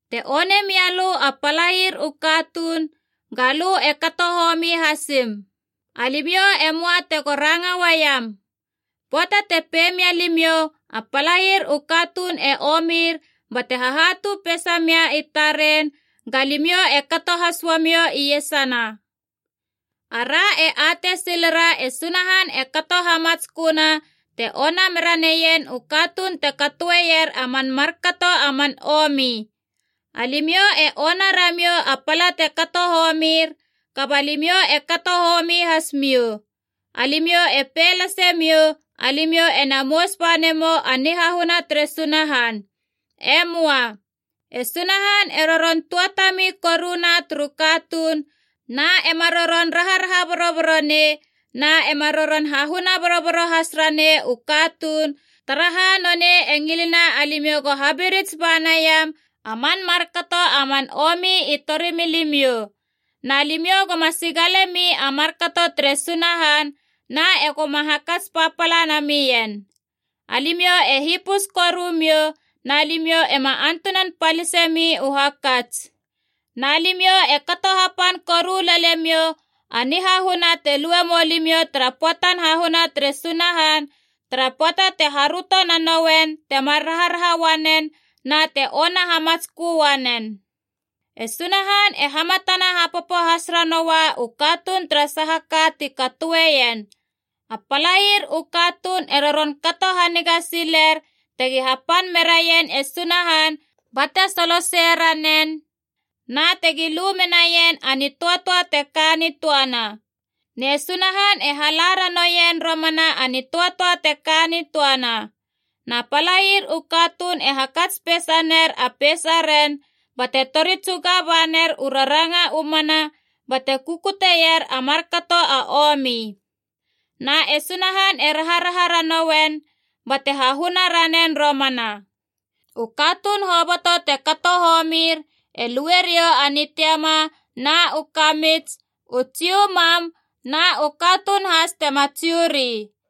Te one mia lö a palair u katuun, ga lö e kato homi hasim. Alimiou e möa tego ranga uaiam. Pöata te pei mia limiou a palair u katuun e omir bate hahatu peisa mia i taren, ga limiou e kato has uamiou iesana. Ara e atei silera e Sunahan e kato hamatsköna te ona mera neien u katuun te katoeier a man markato a man omi. Alimiou e ona ramiou a pala te kato homir, kaba limiou e kato homi has miou. Alimiou e pei lase miou alimiou ena mous bane mou u nihahuna tere Sunahan. E möa. E Sunahan e roron tuatami koruna turu katuun, na ema roron raharaha boroboro nei na ema roron hahuna boroboro has ranei u katuun, taraha nonei e ngilena alimiou go habirits ba naiam a man markato a man omi i torimilimiou. Na limiou goma sigalemi a markato tere Sunahan na egoma hakats papala namien. Alimiou e hipus koru miou, na limiou ema antunan palisemi u hakats. Na limiou e kato hapan koru lele miou a nihahuna te lue moa limiou tara pöatan hahuna tere Sunahan, tara pöata te haröto nanouen temar raharaha uanen na te ona hamatskö uanen. E Sunahan e hamatana hapopo has ranoua u katuun tara saha ka ti katoeien. A palair u katuun e roron kato haniga siler tegi hapan meraien e Sunahan bate solosei ranen, na tegi lu menaien a nitöatöa teka nitöana. Ne Sunahan e hala ranouien romana a nitöatöa te ka nitöana. Na palair u katuun e hakats peisa ner a peisaren bate tori tsuga ba ner u raranga u mana bate kukuteier a markato a omi. Na e Sunahan e raharaha ranouen bate hahuna ranen romana. U katuun hoboto te kato homir e lue riou a nitiama na u kamits, u Jiu mam, na u katuun has tema Jiu ri.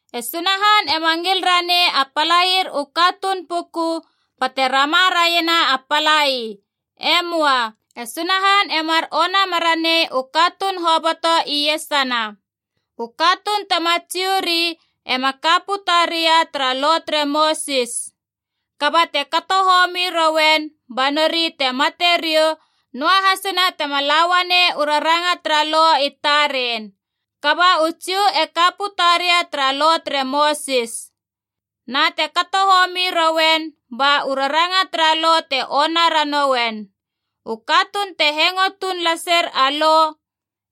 E Sunahan ema ngil ranei a palair u katuun puku bate rama raiena a palai. E möa. E Sunahan e mar ona meranei u katuun hoboto iesana. U katuun tema Jiu ri ema ka puta ria tara Lo tere Mosis. Kaba te kato homi rouen, ba nori te mate riou, noahasina tema la uanei u raranga tara Lo i taren. Kaba u Jiu e ka puta ria tara Lo tere Mosis. Na te kato homi rouen, ba u raranga tara Lo te ona ranouen. U katuun te hengo tuun laser a Lo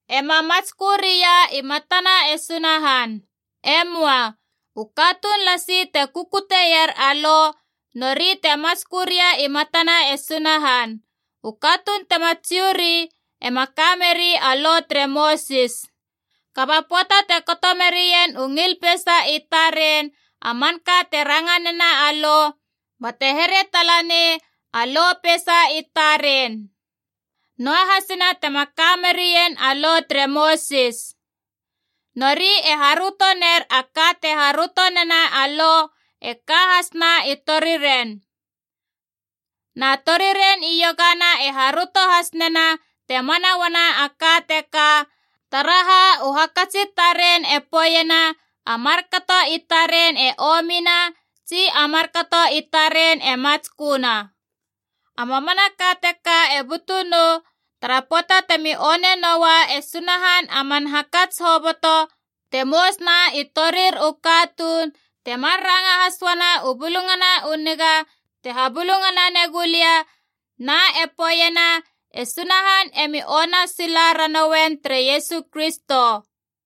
ema matskö ria i matana e Sunahan. E möa. U katuun lasi te kukuteier a Lo, nori te matskö ria i matana e Sunahan. U katuun tema Jiu ri ema ka meri a Lo tere Mosis. Kaba pöata te kato merien u ngil peisa i taren a manka te ranga nena a Lo, bate here tala nei a lo peisa i taren, noahasina tema ka merien a Lo tere Mosis. Nori e haröto ner a ka te haröto nena a Lo e ka hasna i toriren. Na toriren iogana e haröto has nena te mana uana a ka teka, taraha u hakats i taren e poeiena a markato i taren e omina tsi a markato i taren e matsköna. A mamanaka teka e butu nou tara pöata temi one noua e Sunahan a man hakats hoboto te mousuna i torir u katuun, temar ranga has uana u Bulungana u Niga te habulungana negulia na e poeiena e Sunahan emi ona sila ranouen tere Iesu Kristo.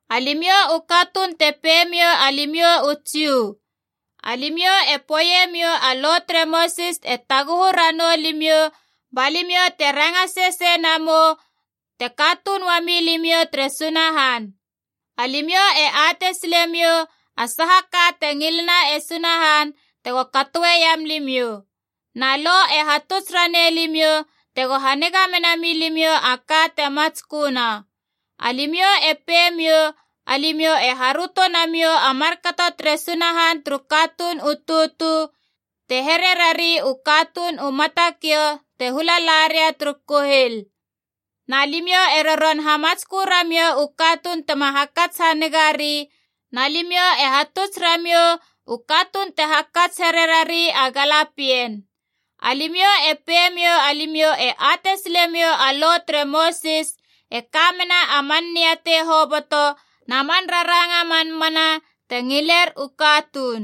Alimiou u katuun te pei miou alimiou u Jiu. Alimiou e poeiemiou a Lo tere Mosis e taguhu ranou limiou, ba limiou te ranga sesei namou te katuun uami limiou tere Sunahan. Alimiou e atei silemiou a saha ka te ngilena e Sunahan, tego katoeiam limiou. Na Lo e hatuts ranei limiou tego haniga mena milimiou a ka te matsköna. Alimiou e peimiou alimiou e haröto namiou a markato tere Sunahan turu katuun u tutu, te here rari u katuun u matakiou te hula la ria turu kuhil. Na limiou e roron hamatskö ramiou u katuun tema hakats hanigari, na limiou e hatuts ramiou u katuun te hakats here rari a galapien. Alimiou e peimiou alimiou e atei silemiou a Lo tere Mosis e ka mena a man niatei hoboto na man raranga a man mana te ngiler u katuun.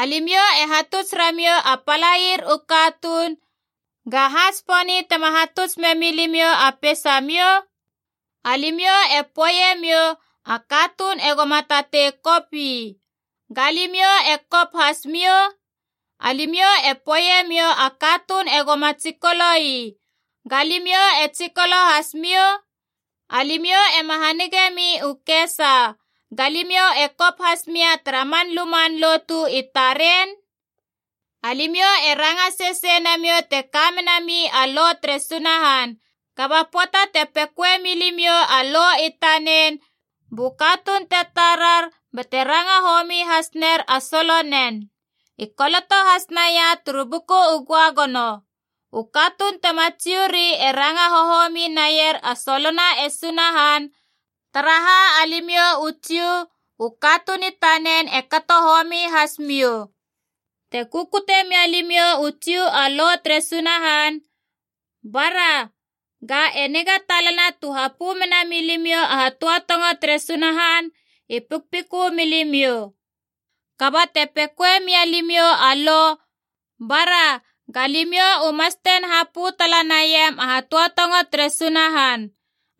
Alimiou e hatuts ramiou a palair u katuun, ga ha tsiponi tema hatuts memilimiou a peisamiou? Alimiou e poeiemiou a katuun egoma tatei kop ii. Ga limiou e kop has miou? Alimiou e poeiemiou a katuun egoma tsikolo ii. Ga limiou e tsikolo hasmiou? Alimiou ema hanige mi u kesa, ga limiou e kop has mia tara man luman lotu i taren? Alimiou e ranga sesei namiou te ka menami a Lo tere Sunahan, kaba pöata te pekoemi limiou a Lo i tanen, bu katuun te tarar bate ranga homi has ner a solonen. I koloto has naia turu Buku u Göagono, “U katuun tema Jiu ri e ranga hohomi naier a solona e Sunahan, taraha alimiou u Jiu, u katuun i tanen e kato homi has miou.” Te kukute mia limiou u Jiu a Lo tere Sunahan, bara, ga e niga talana tu hapö mena milimiou a hatöatongo tere Sunahan i pikpikö milimiou. Kaba te pekoe mia limiou a Lo, bara, ga limiou u mastein hapö tala naiam a hatöatongo tere Sunahan.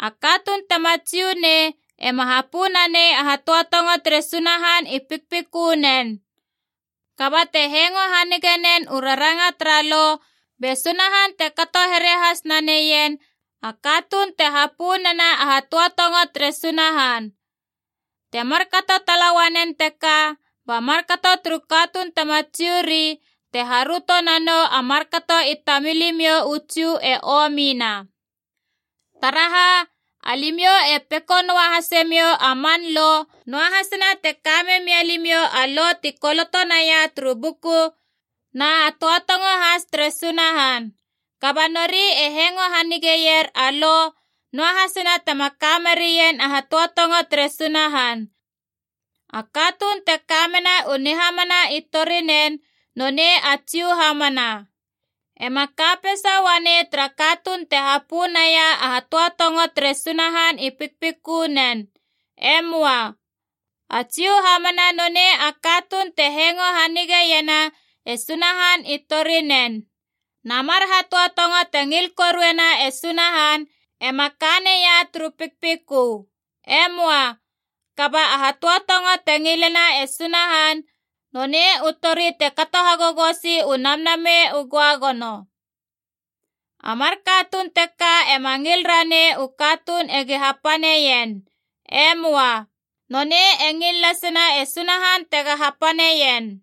A katuun tema Jiu nei ema hapö nanei a hatöatongo tere Sunahan i pikpikönen. Kaba te hengo hanige nen u raranga tara Lo, be Sunahan te kato here has naneien a katuun te hapö nena a hatöatongo tere Sunahan. Te markato tala uanen teka ba markato turu katuun tema Jiu ri te haröto nanou a markato i tamilimiou u Jiu e omina. Taraha, alimiou e peko noa hasemiou a man Lo, noahasina te ka memia limiou a Lo ti koloto naia turu Buku na hatöatongo has tere Sunahan. Kaba nori e hengo hanigeier a Lo, noahasina tema ka merien a hatöatongo tere Sunahan. A katuun te ka mena u nihamana i torinen nonei a Jiu hamana. Ema ka peisa uanei tara katuun te hapö naia a hatöatongo tere Sunahan i pikpikönen. E möa. A Jiu hamana nonei a katuun te hengo hanigeiena e Sunahan i torinen. Na mar hatöatongo te ngil koruena e Sunahan ema ka neia turu pikpikö. E möa. Kaba a hatöatongo te ngilena e Sunahan nonei u tori te kato hagogosi u Namnamei u Göagono. A mar katuun teka ema ngil ranei u katuun egi hapaneien. E möa. Nonei e ngil lasena e Sunahan tega hapaneien.